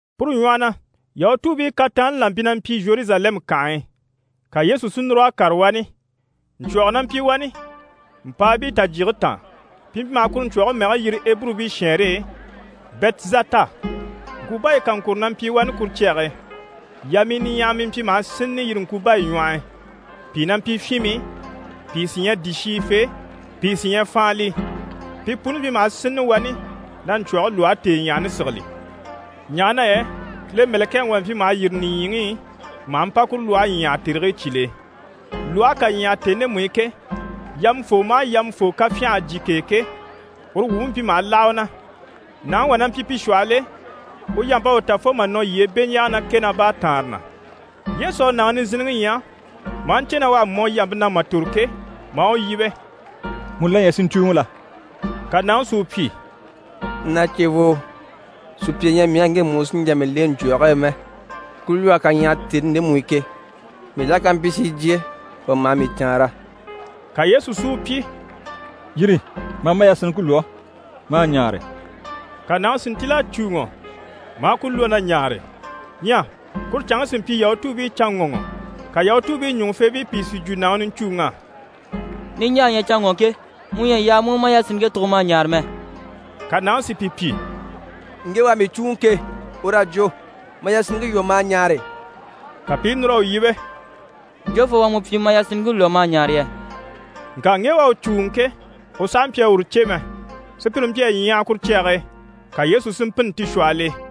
Puru ɲwɔhɔ na, Yahutuubii kataanni là mpyi na mpyi Zheruzalɛmu kànhe e, ka Yesu si núr'a kàre wani. Ɲcwɔ̀gɔ na mpyi wani, mpàabii tajyige taan, pi mpyi maha kuru ɲcwɔ̀ge mɛge yiri Eburubii shɛɛnre e: «Bɛtizata». Ŋkubaya kaŋkuro na mpyi wani kuru cyage e. Yamii niɲyahamii mpyi maha sínnini yire ŋkubayi ɲwɔh'i. Pìi na mpyi fyinmii, pìi sí ɲyɛ dìshiyifee, pìi sí ɲyɛ faanlii. [Pi puni mpyi maha sínnini wani na ɲcwɔ̀ge lwɔhe tèeɲyahani sigili, ɲaha na yɛ Kile mɛ̀lɛkɛŋi wà mpyi maha yîri nìɲyiŋi i maha mpa kuru lwɔhe ɲyàha tèrigii cyìl'e. Lwɔhe ká ɲyàha tèni ndemu i ke, yamafoo maha yamafoo ká fyânha a jyè k'e ke, uru wumpe mpyi maha láha u na.] Nàŋi wà na mpyi pi shwɔhɔl'e, u yamp'à u ta fo mà nɔ yyee beɲjaaga ná kɛ ná baataanre na. Yesu à nàŋi nizinniŋi ɲya, maa ɲcè na u à mɔ yampe na mà tòro ke, maa u yíbe: «Mu la ɲyɛ si ɲcùuŋɔ la?» Ka nàŋi si u pyi: «Na cevoo, sùpya ɲyɛ mii á ŋge u sí n‑jà mii lèŋɛ ɲcwɔ̀ge e mɛ. Ku lwɔhe ká ɲyàha tèni ndemu i ke, mii la ká mpyi si jyè, wà maha mii caanra.» Ka Yesu si u pyi: «Yîri, ma a ma yasinniŋke lwɔ́, ma a ɲaare.» Ka nàŋi si ntíl'a cùuŋɔ maa ku lwɔ́ na ɲaare. Ɲyɛ kuru canŋke sí mpyi Yahutuubii canŋɔŋɔ, ka Yahutuubii ɲùŋufeebii pìi si jwo nàŋi niɲcuuŋ'á: «Niɲjaa ɲyɛ canŋɔŋke, mu ɲyɛ a yaa mu u ma yasinniŋke tùgo ma a ɲaare mɛ.» Ka nàŋi si pi pyi: «Ŋge u à mii cùuŋɔ ke, ur'à jwo “Ma yasinniŋke lwɔ́, ma a ɲaare!”» Ka pi i núr'a u yíbe: «Jofoo u à mu pyi “Ma yasinniŋke lwɔ́ ma a ɲaare” yɛ?» Ŋka ŋge u à u cùuŋɔ ke, u sàha mpyi a uru cè mɛ, sùpyire mpyi a ɲyaha kuru cyage e, ka Yesu si mpînni ti shwɔhɔl'e.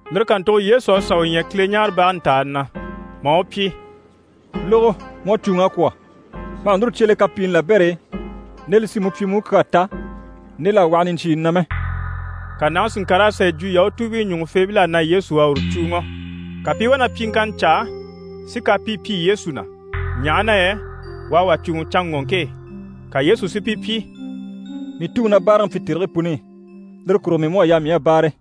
Lire kàntugo Yesu à sà u ɲya Kileɲaarebage ntàani na, maa u pyi: «Lógo, mu à cùuŋ'a kwɔ̀. Ma hà núru cye le kapiini labɛr'e nde li sí mu pyi mu u kyaa ta nde l'à waha niɲcyiini na mɛ.» Ka nàŋi si ŋkàr'a sà yi jwo Yahutuubii ɲùŋufeebil'á na Yesu u à uru cùuŋɔ. Ka pi i wá na pyiŋkanna caa si kapii pyi Yesu na, ɲaha na yɛ u à wà cùuŋɔ canŋɔŋke e. Ka Yesu si pi pyi: «Mii Tuŋi na báaraŋi pyi tèrigii puni i, lire kurugo mii mú à yaa mii a báare.»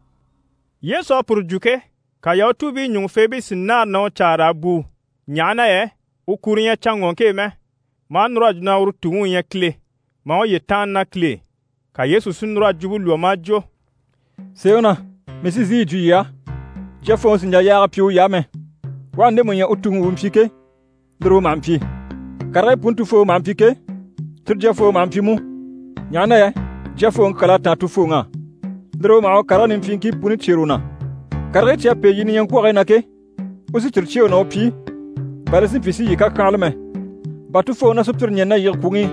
Yesu à puru jwo ke, ka Yahutuubii ɲùŋufeebii si nâara na u caa raa bùu, ɲaha na yɛ u kuro ɲyɛ canŋɔŋke e mɛ, maa núr'a jwo na uru Tuŋi u ɲyɛ Kile, maa uye tàanna ná Kile e. Ka Yesu si núr'a jwumpe lwɔ́ maa jwo: «Sèeŋi na mii sí n‑sìi yi jwo yii á, Jyafooŋi sì n‑jà yaaga pyi uy'á mɛ, u aha ndemu ɲya u Tuŋi u u mpyi ke, lire u maha mpyi. Karigii puni Tufooŋi maha mpyi ke, cyire Jyafooŋi maha mpyi mú, ɲaha na yɛ Jyafooŋi kyal'à táan Tufooŋi á. Lire e u maha u karigii nimpyiiŋkii puni cyêre u na. Karigii cyi à pêe yii niɲyaŋkwɔgigii na ke, u sí cyire cyêe u na u pyi, bà li si mpyi si yii kàkyanhala mɛ. Bà Tufooŋi na sùpyire ɲɛ̀ni na yige kwùŋi i,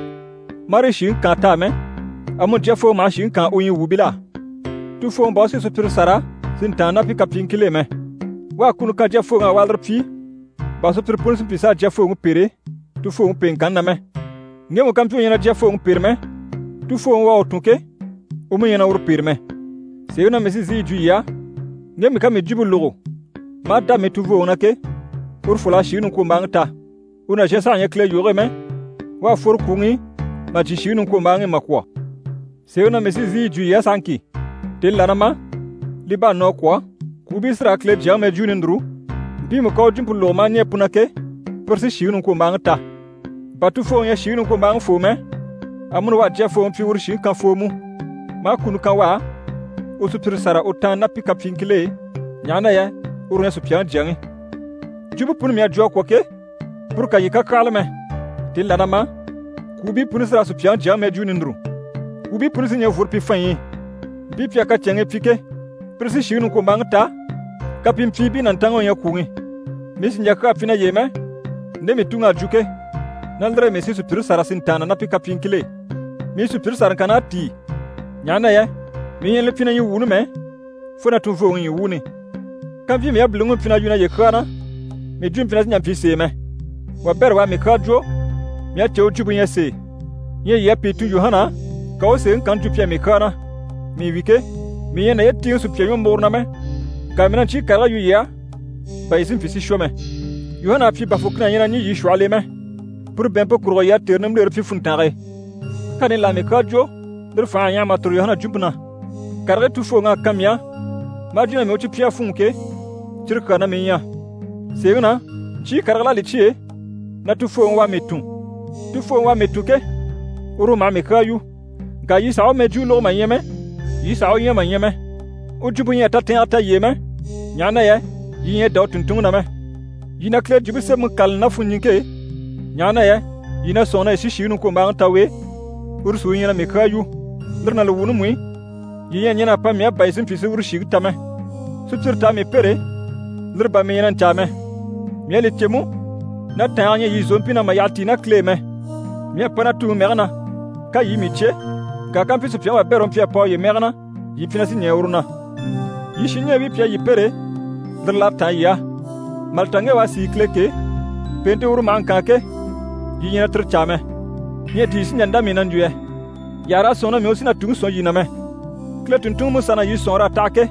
marii shìŋi kaan t'á mɛ, amuni Jyafooŋi maha shìŋi kaan u ɲyii wuubil'á. Tufooŋi bà u sí sùpyire sâra si ntàanna ná pi kapyiiŋkil'e mɛ, u à kuni kan Jyafooŋi á u a lire pyi, bà sùpyire puni si mpyi s'a Jyafooŋi pêre, Tufooŋi pèeŋkanni na mɛ. Ŋgemu ká mpyi u ɲyɛ na Jyafooŋi pêre mɛ, Tufooŋi u à u tun ke, u mú ɲyɛ na uru pêre mɛ. Sèeŋi na mii sí n‑sìi yi jwo yii á, ŋgemu ká mii jwumpe lógo maa dá mii tunvooŋi na ke, urufol'à shìŋi niŋkwombaaŋi ta. U nàzhan saha ɲyɛ Kile yoge e mɛ, u à fworo kwùŋi i mà jyè shìŋi niŋkwombaaŋi i mà kwɔ̀. Sèeŋi na mii sí n‑sìi yi jwo yii á sahaŋki, tèni là na ma, li bá à nɔ a kwɔ̀, kwùubii sí raa Kile Jyaŋi mɛjwuuni núru, mpiimu ká u jwumpe lógo maa ɲɛɛ pu na ke, pire sí shìŋi niŋkwombaaŋi ta. Bà Tufooŋi ɲyɛ shìŋi niŋkwombaaŋifoo mɛ, amuni u à Jyafooŋi pyi uru shìŋi kanfoo mú, maa kuni kan u á u sùpyire sâra u tàanna ná pi kapyiiŋkil'e, ɲaha na yɛ uru u ɲyɛ Supyaŋi Jyaŋi. Jwumpe puni mii à jwo a kwɔ̀ ke, puru kà yii kàkyanhala mɛ, tèni là na ma, kwùubii puni sí raa Supyaŋi Jyaŋi mɛjwuuni núru. Kwùubii puni sí ɲɛ̀ n‑fworo pi fanɲyi i. Mpii pi à kacɛnŋii pyi ke, pire sí shìŋi niŋkwombaaŋi ta, kapimpyiibii nàntanŋi u ɲyɛ kwùŋi. Mii sì n‑jà kyaa pyi naye e mɛ, nde mii Tuŋi à jwo ke, ná lire e mii sí sùpyire sâra si ntàanna ná pi kapyiiŋkil'e. Mii sùpyire sàraŋkann'à tíi, ɲaha na yɛ mii ɲyɛ na li pyi na ɲyii wuuni mɛ, fo na tunvooŋi ɲyii wuuni. Kàmpyi mii yabiliŋi u mpyi na yu naye kyaa na, mii jwumpe mpyi na sì n‑jà n‑pyi sèe mɛ. Wabɛrɛ u à mii kyaa jwo, mii à cè u jwumpe ɲyɛ sèe. Ɲyɛ yii à pìi tun Yuhana á, ka u u sèeŋi kanni jwo pi á mii kyaa na. Mii wi ke, mii ɲyɛ a naye tíiŋɛ sùpya ɲwɔmuguro na mɛ, ŋka mii na ɲcyii karigii yu yii á, bà yii si mpyi si shwɔ mɛ. Yuhana à pyi bà fùkina ɲyɛ na ɲî yii shwɔhɔl'e mɛ. Puru bɛ̀ɛnmpe kurugo yii à tère nimbilere pyi funntange e. Kani là à mii kyaa jwo, lire fành'à ɲyaha mà tòro Yuhana jwumpe na. Karigii Tufooŋi à kan mii á maa jwo na mii u cyi pyi a fûnŋɔ ke, cyire kyaa na mii ɲyɛ. Sèeŋi na, ɲcyii karigil'à li cyêe na Tufooŋi u à mii tun. Tufooŋi u à mii tun ke, uru u maha mii kyaa yu. Ŋka yii sàha u mɛjwuuni lógo mà ɲya mɛ, yii sàha u ɲya mà ɲya mɛ. U jwumpe ɲyɛ a tatɛɛnge ta yii e mɛ, ɲaha na yɛ yii ɲyɛ a dá u tùnntunŋi na mɛ. Yii na Kile Jwumpe Semɛŋi kâlali ná funɲiŋke e, ɲaha na yɛ yii na sɔ̂nŋi na yii sí shìŋi niŋkwombaaŋi ta u e, uru sí u ɲyɛ na mii kyaa yu. Lire ná li wuuni mú i, yii ɲyɛ a ɲɛn'a pa mii á bà yii si mpyi si uru shìŋi ta mɛ. Sùpyire t'a mii pêre, lire bà mii ɲyɛ na ɲcaa mɛ. Mii à li cè mú na tàange ɲyɛ yii zòompii na mà yyaha tíi ná Kile e mɛ. Mii à pa na Tuŋi mɛge na, ka yii i mii cyé, ŋka kàmpyi sùpyaŋi wabɛrɛ u mpyi a pa uye mɛge na, yii mpyi na sí ɲɛɛ uru na. Yii shinɲɛɛbii pi a yii pêre, lire l'à táan yii á. Mà li ta ŋge u à sìi Kile ke, pèente uru maha ŋkaan ke, yii ɲyɛ na tire caa mɛ. Ɲyɛ di yii sí n‑jà n‑dá mii na n‑jwo yɛ? Yii àha raa sɔ̂nŋi na mii u sí na Tuŋi sɔ̀n yii na mɛ. Kile tùnntunŋiMusa na yii sɔ̀nŋɔr'à taha ke,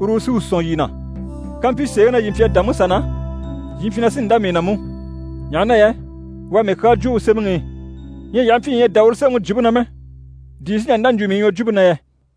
uru u sí u sɔ̀n yii na. Kàmpyi sèeŋi na yii mpyi a dá Musa na, yii mpyi na sí n‑dá mii na mú, ɲaha na yɛ u à mii kyaa jwo u sémɛŋi i. Ɲyɛ yii aha mpyi yii ɲyɛ a dá uru sémɛŋi jwumpe na mɛ, di yii sí n‑jà n‑dá n‑jwo mii ɲwɔjwumpe na yɛ?»